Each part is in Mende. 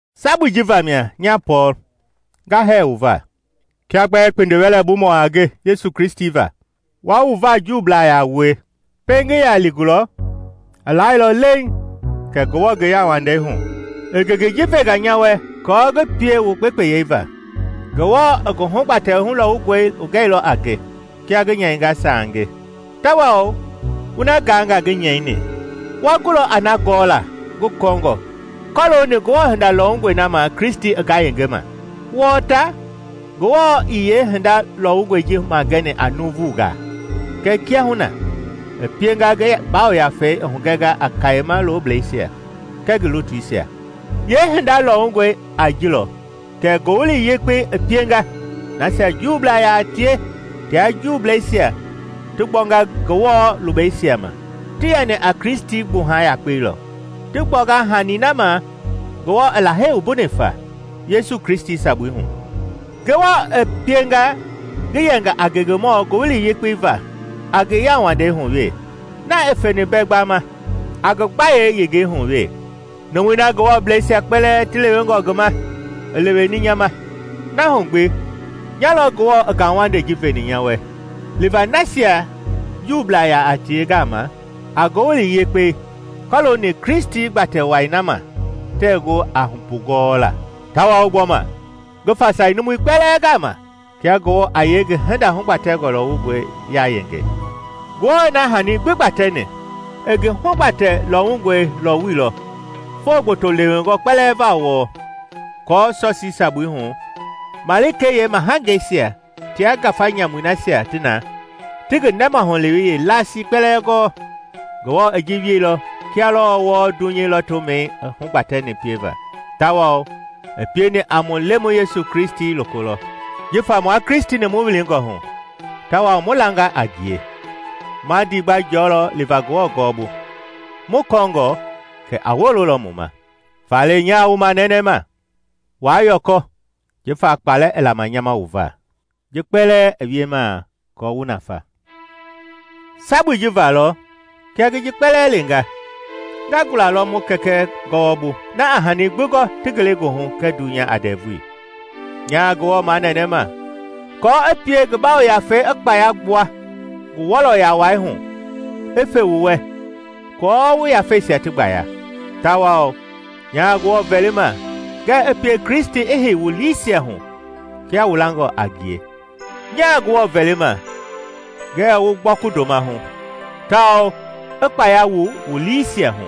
Sabui ji vamia, nya Pɔɔl, nga hɛɛ wu va, kia bɛɛ kpindiwɛlɛbumɔ a nge Yesu Kristi va, wua wu va Juublaa yaa wue. Pɛiŋ ngi ya li gulɔ, i laailɔ leiŋ kɛ Ngewɔ, ngi yauwandei hu, i ngengei ji venga nya wɛ kɔɔ ngi pie wu gbekpeyei va. Ngewɔ i ngi hugbatɛ lɔwungɔe hugɛilɔ a nge, kia ngi nyɛinga sange. Tawao wu na gaangaa ngi nyɛini, wa gulɔ a na gɔla ngi kɔɔngɔ kɔlooni Ngewɔ hinda lɔwungɔi na ma Kristi i ngayengema. Wɔɔ ta, Ngewɔ ii yeehinda lɔwungɔi ji magɛni a nuuvungaa kɛɛ kiahuna i pienga ngi Yafei i hugɛnga a kayema looblɛisia kɛɛ ngi lutuisia. Yeehinda lɔwungɔi a ji lɔ kɛ Ngowili Yekpei i pienga nasia Juublaa yaa tie tia Juubleisia ti gbɔnga Ngewɔ lubeisia ma; ti yɛni a Kristi gbuha yakpei lɔ, ti gbɔngɔ hani na ma Ngewɔ i Lahei wumbuni fa, Yesu Kristi sabui hu. Ngewɔ pienga ngi yɛnga a ngengemɔ ngowili yekpei va a ngi yauwandei hu we, na i feni mbɛ gbama, a ngi gbayei yengeihu wɛ. Numui na Ngewɔbleisia kpɛlɛɛ ti lewengɔ ngi ma, i leweni nya ma; na hu gbi nya lɔ Ngewɔ i ngauwandei ji veni nya wɛ liva nasia Juublaa yaa tie gama a Ngowili Yekpei kɔlooni Kristi gbatɛ wai na ma tɛɛ gu a mbugɔɔla; tawao gbɔma ngi fasai numui kpɛlɛɛ gama kia Ngewɔ a yee ngi hinda hugbatɛngɔ lɔwungɔi yayenge. Ngewɔ na hani gbi gbatɛni, i ngi hugbatɛ lɔwungɔi lɔwuilɔ foo gboto lewengɔ kpɛlɛɛ va wɔɔ, aako sɔsii sabui hu, malikei yeemahangeisia tia ngafa nyamui nasia ti na ti ngi nɛmahulewei yeelasii kpɛlɛɛ gɔɔ. Ngewɔ i ji wieilɔ kia lɔɔ wɔɔ dunyei lɔtomɛi i hugbatɛni pieva, tawao i pieni a mu Lemɔi Yesu Kristi loko lɔ. Jifa mua Kristi-ni mu wilingɔ hu tawao mu langa a ngie, ma ndiigba jɔlɔ liva Ngewɔ gɔɔbu, mu kɔɔngɔ kɛ a wololɔ mu ma. Faale nyaa wu manɛnɛma, waa yɔkɔ jifa kpalɛ i lama nya ma wu va; ji kpɛlɛɛ i wiemaa aako wu nafa. Sabui ji va lɔ kia ngi ji kpɛlɛɛ lenga nga gula lɔ mu Kɛkɛ gɔwɔbu, na a hani gbi gɔ ti ngelegoohu kɛɛ dunya a ndɛvui. Nyaa Ngewɔ manɛnɛma kɔɔ i pie ngi Yafei i kpaya gbua ngi wɔlɔya wai hu i fe wu wɛ aako wu yafeisia ti gbaya, tawao nyaa Ngewɔ vɛlima ngɛɛ i pie Kristi i hei wu liisia hu kia wu langɔ a ngie. Nyaa Ngewɔ vɛlima ngɛɛ wu gbɔku ndoma hu, tawao i gbaya wu liisia hu,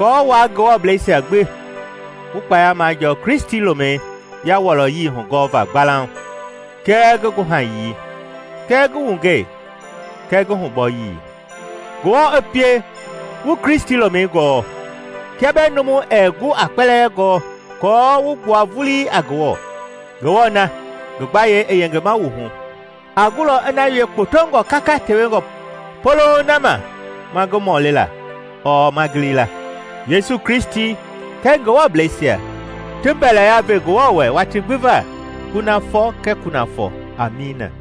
aako wua Ngewɔbleisia gbi wu kpaya majɔɔ Kristi lomɛi yawɔlɔyii hugɔva gbalauŋ kɛɛ ngi guhayii kɛɛ ngi wungɛi kɛɛ ngi hubɔyii. Ngewɔ i pie wu Kristi lomɛi gɔɔ, kia bɛɛ numu ɛɛ gu aa kpɛlɛɛ gɔɔ, aako wu gbua vulii a Ngewɔ. Ngewɔ na, ngi gbayei i yengema mu hu, a gulɔ i na wie kpotongɔ kaka tewengɔ polouŋ na ma ma ngi mɔlila ɔɔ ma gilila, Yesu Kristi kɛɛ Ngewɔbleisia ti mbɛlɛya ve Ngewɔ wɛ watii gbi va, kunafɔ kɛɛ kunafɔ. Amiina.